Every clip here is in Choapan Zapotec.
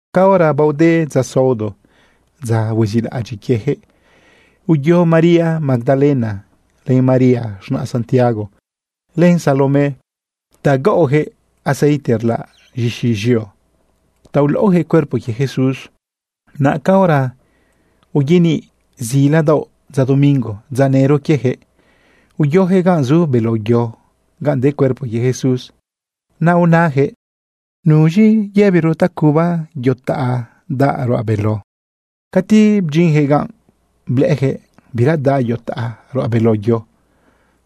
Caora baode dza saodo, dza huezilaꞌadyiꞌ quieyaquëꞌ, uyo María Magdalena, len María z̃naꞌ Santiago, len Salomé ta gaꞌoyaquëꞌ aceite rlaꞌ z̃ixi z̃eo ta ulaꞌoyaquëꞌ cuerpo quie Jesús. Naꞌ caora uyaniꞌ zila daoꞌ dza domingo, dza nëro quieyaquëꞌ, uyoyaquëꞌ ganꞌ zu beló yo ganꞌ de cuerpo quie Jesús. Naꞌ unayaquëꞌ: ―¿Nuz̃i yëbiro ta cubayaquëꞌ yo taꞌa daꞌ ruꞌa beló? Cati bdyinyaquëꞌ ganꞌ, blëꞌëyaquëꞌ bira daꞌ yo taꞌa ruꞌa beló yo.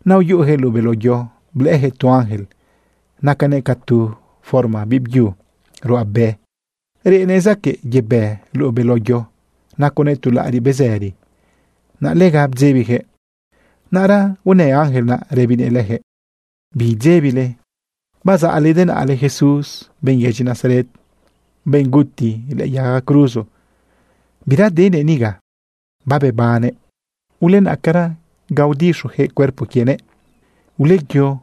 Naꞌ uyuꞌuyaquëꞌ luꞌu beló yo, blëꞌëyaquëꞌ tu ángel nacanëꞌ ca tu forma biꞌbyu ruꞌabe. Reꞌnëꞌ zaquëꞌ yebë luꞌu beló yo, naconëꞌ tu laꞌariꞌ bezëri. Naꞌ lega bdzebiyaquëꞌ. Naꞌra unë ángel naꞌ rëbinëꞌ leyaquëꞌ: ―Bidzebile. Bazaꞌle denaꞌle Jesús, benꞌ yedyi Nazaret, benꞌ guti lëꞌë yaga cruzo. Bira denëꞌ niga, babebannëꞌ. Ulenaꞌcara ga udixoyaquëꞌ cuerpo quienëꞌ. Uleyo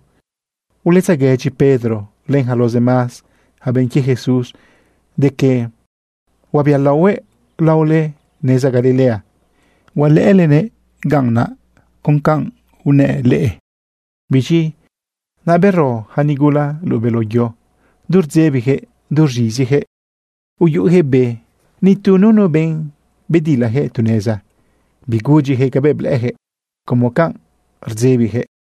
uletzeguëdyi Pedro len yaca los demás yaca benꞌ quie Jesús de que huabialaohuëꞌ laole neza Galilea. Hualëꞌëlenëꞌ ganꞌ con ca rniaꞌ. Biz̃i naꞌ bero yaca nigula luꞌu beló yo. Du rdzebiyaquëꞌ du rz̃iziyaquëꞌ uyuꞌuyaquëꞌ be. Nitu nunu benꞌ bedilayaquëꞌ tu neza bigudyiyaquëꞌ cabëꞌ blëꞌëyaquëꞌ como canꞌ rdzebiyaquëꞌ.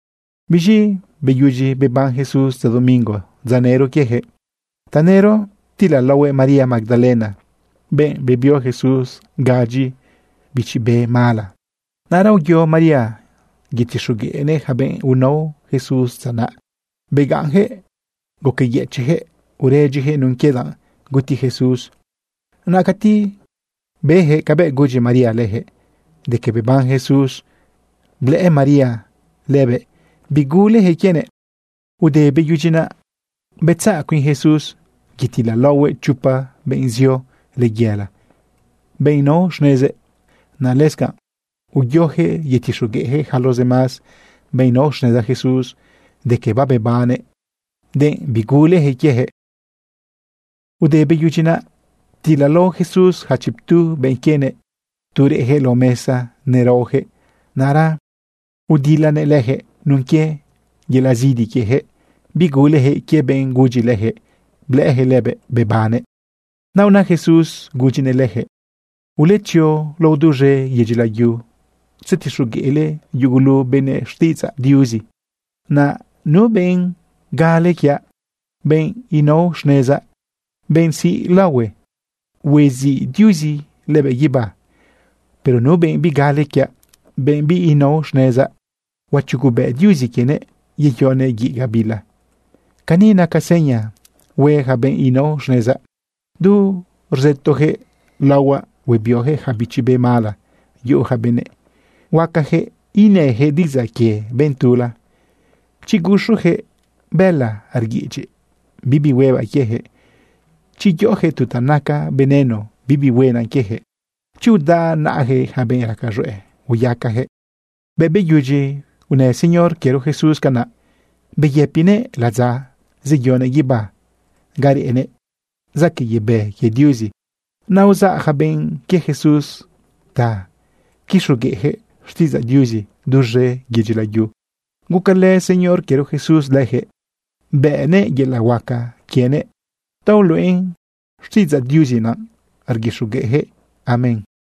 Biz̃i beyudyi beban Jesús dza domingo, dza nëro quieyaquëꞌ, tanëro ptilalaohuëꞌ María Magdalena, benꞌ bebio Jesús gadyi bichi be mala. Naꞌra uyo María tzetixogueꞌnëꞌ yaca benꞌ unao Jesús dza naꞌ. Begaꞌnyaquëꞌ guqueyëchiꞌyaquëꞌ uredyiyaquëꞌ nun quie danꞌ guti Jesús. Naꞌ cati beyaquëꞌ cabëꞌ gudyi María leyaquëꞌ de que beban Jesús, blëꞌë María lëbëꞌ, biguleyaquëꞌ quienëꞌ. Te beyudyi naꞌ, betzaꞌ cuin Jesús yetilalaohuëꞌ chopa benꞌ zio layela, benꞌ nao xnezëꞌ. Naꞌ lëscanꞌ uyoyaquëꞌ yetixogueꞌyaquëꞌ yaca los demás benꞌ nao xneza Jesús de que babebannëꞌ, denꞌ biguleyaquëꞌ quieyaquëꞌ. Te beyudyi naꞌ, ptilalao Jesús yaca chiptu benꞌ quienëꞌ tu reꞌyaquëꞌ lao mesa neraoyaquëꞌ. Naꞌra udilanëꞌ leyaquëꞌ nun quie yelaꞌ zidi quieyaquëꞌ biguleyaquëꞌ quie benꞌ gudyi leyaquëꞌ blëꞌëyaquëꞌ lëbëꞌ bebannëꞌ. Naꞌ una Jesús gudyinëꞌ leyaquëꞌ: ―Uletzio lao duz̃e yedyi layu tzetixogueꞌle yugulu benëꞌ xtiꞌidzaꞌ Diuzi. Naꞌ nu benꞌ gale quiaꞌ, benꞌ nao xnezaꞌ, benꞌ siꞌ laohue, huaziꞌ Diuzi lëbëꞌ guibá. Pero nu benꞌ bigale quiaꞌ, benꞌ binao xnezaꞌ, huachugubëꞌ Diuzi quienëꞌ yeyonëꞌ guiꞌ gabila. Cani naca seña hue yaca benꞌ inao xnezaꞌ. Du rzëtoyaquëꞌ laohuaꞌ huebioyaquëꞌ yaca bichi be mala yuꞌu yaca benëꞌ. Huacayaquëꞌ inayaquëꞌ diꞌidzaꞌ quie benꞌ tula. Chi guxuyaquëꞌ bëla rguiꞌidyiꞌ, bibi huebaꞌ quieyaquëꞌ. Chi yoꞌoyaquëꞌ tu ta naca veneno, bibi huena quieyaquëꞌ. Chi udaꞌ naꞌayaquëꞌ yaca benꞌ raca z̃hueꞌ, hueyacayaquëꞌ. Bëꞌ beyudyi unë Señor quiero Jesús canaꞌ, beyëpinëꞌ ladza zeyonëꞌ guibá ga reꞌnëꞌ zaquëꞌ yebë quie Diuzi. Naꞌ uzaꞌ yaca benꞌ quie Jesús ta quixogueꞌyaquëꞌ xtiꞌidzaꞌ Diuzi duz̃e yedyi layu. Gucalë Señor quiero Jesús leyaquëꞌ, bënëꞌ yelaꞌ huaca quienëꞌ ta uluꞌen xtiꞌidzaꞌ Diuzi naꞌ rguixogueꞌyaquëꞌ. Amén.